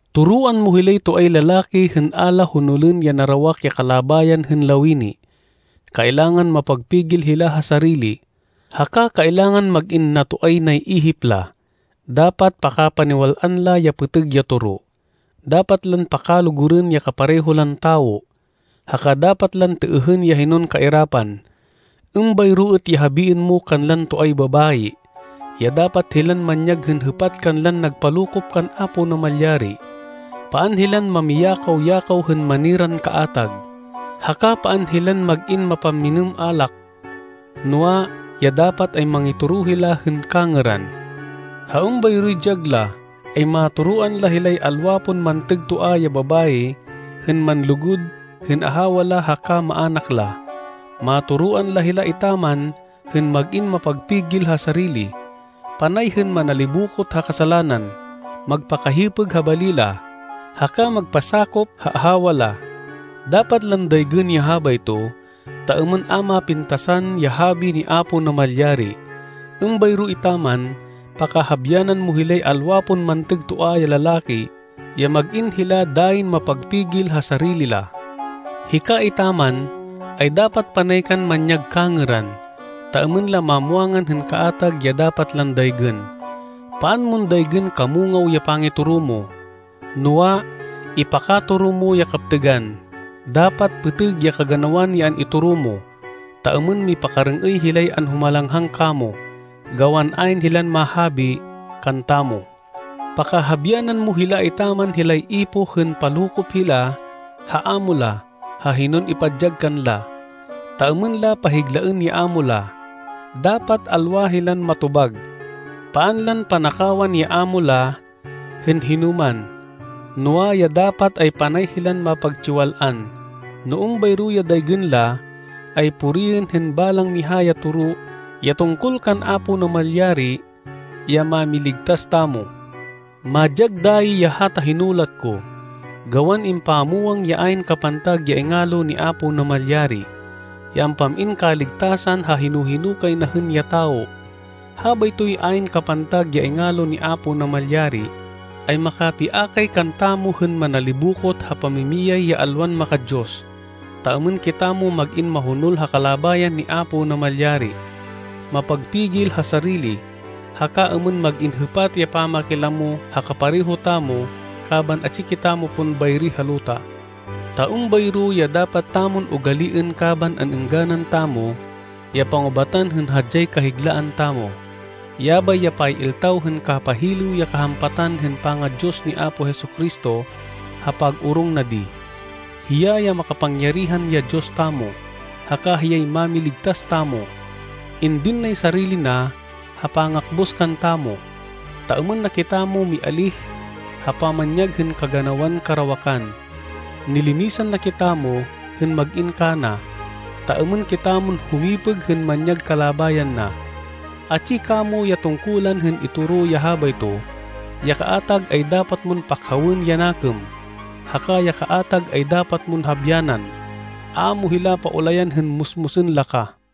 Toroan mo hilay toay lalaki hên a la honolên ya narawak ya kalabayan hên lawini. Kailangan mapagpigil hila ha sarili, haka kailangan mag-in natoay nay ihip la. Dapat pakapaniwal-an la ya pêtêg ya toro, dapat lan pakalugurên ya kapareho lan tawo, haka dapat lan têêhên ya hinon kairapan. Êmbayro êt ya habiên mo kanlan toay babayi, ya dapat hilan manyag hên hêpat kanlan nagpalokop kan Apo Namalyari. Paan hilan mamiyakaw-yakaw hên maniran kaatag, haka paan hilan mag-in mapamminêm alak, noa, ya dapat ay mangitoro hila hên kangêran. Ha êmbayroy dyag la, ay matoroan la hilay alwa pon mantêg toa ya babayi hên manlugud hên ahawa la haka maának la. Matoroan la hila etaman hên mag-in mapagpigil ha sarili, panay hên manalibokot ha kasalanan, magpakahipêg ha bali la, haka magpasakop ha ahawa la. Dapat lan daygên ya habayto ta êmên a mapintasan ya habi ni Apo Namalyari. Êmbayro etaman pakahabyanan mo hilay alwa pon mantêg toa ya lalaki ya mag-in hila dayin mapagpigil ha sarili la. Hika etaman, ay dapat panay kan manyag kangêran, ta êmên la mamwangan hên kaatag ya dapat lan daygên. Paan mon daygên kamungaw ya pangitoro mo, noa, ipakatoro mo ya kaptêgan. Dapat pêtêg ya kaganawan ya an-itoro mo, ta êmên mipakarêng-êy hilay anhumalanghang kamo, gawan ayn hilan mahabi kantamo. Pakahabyanan mo hila etaman hilay ipoh hên palokop hila ha amo la ha hinon ipadyag kanla, ta êmên la pahiglaên ya amo la. Dapat alwa hilan matobag. Paan lan panakawan ya ámo la hên hinoman, noa, ya dapat, ay panay hilan mapagtsiwal-an. No êmbayro ya daygên la, ay puriên hên balang miha ya toro ya tungkol kan Apo Namalyari, ya Mámiligtas tamo. Madyag dayi ya hata hinulat ko, gawan impamwang ya ayn kapantag ya ingalo ni Apo Namalyari, ya ampam-in kaligtasan ha hino-hino kay na hên ya tawo. Habaytoy ayn kapantag ya ingalo ni Apo Namalyari, ay makapiakay kantamo hên manalibokot ha pamimiyay ya alwan maka-Diyos, ta êmên kitamo mag-in mahonol ha kalabayan ni Apo Namalyari, mapagpigil ha sarili, haka êmên mag-in hêpat ya pamakilamo ha kapareho tamo kaban atsi kitamo pon bayri ha luta. Ta êmbayro ya dapat tamon ugaliên kaban an-êngganan tamo ya pangubatan hên hadyay kahiglaan tamo. Yabay ya pay-iltaw hên kapahilêw ya kahampatan hên panga-Diyos ni Apo Jesu-Cristo ha pag-orong na di. Hiya ya makapangyarihan ya Diyos tamo, haka hiyay Mámiligtas tamo. Indin nay sarili na ha pangakbus kantamo, ta êmên na kitamo mialíh ha pamanyag hên kaganawan karawakan. Nilinisan na kitamo hên mag-in kana, ta êmên kitamon humipêg hên manyag kalabayan na. Atsi kamo ya tungkulan hên itoro ya habayto. Ya kaatag ay dapat mon pakhawên ya nakêm, haka ya kaatag ay dapat mon habyanan. A mo hila paulayan hên musmusên la ka.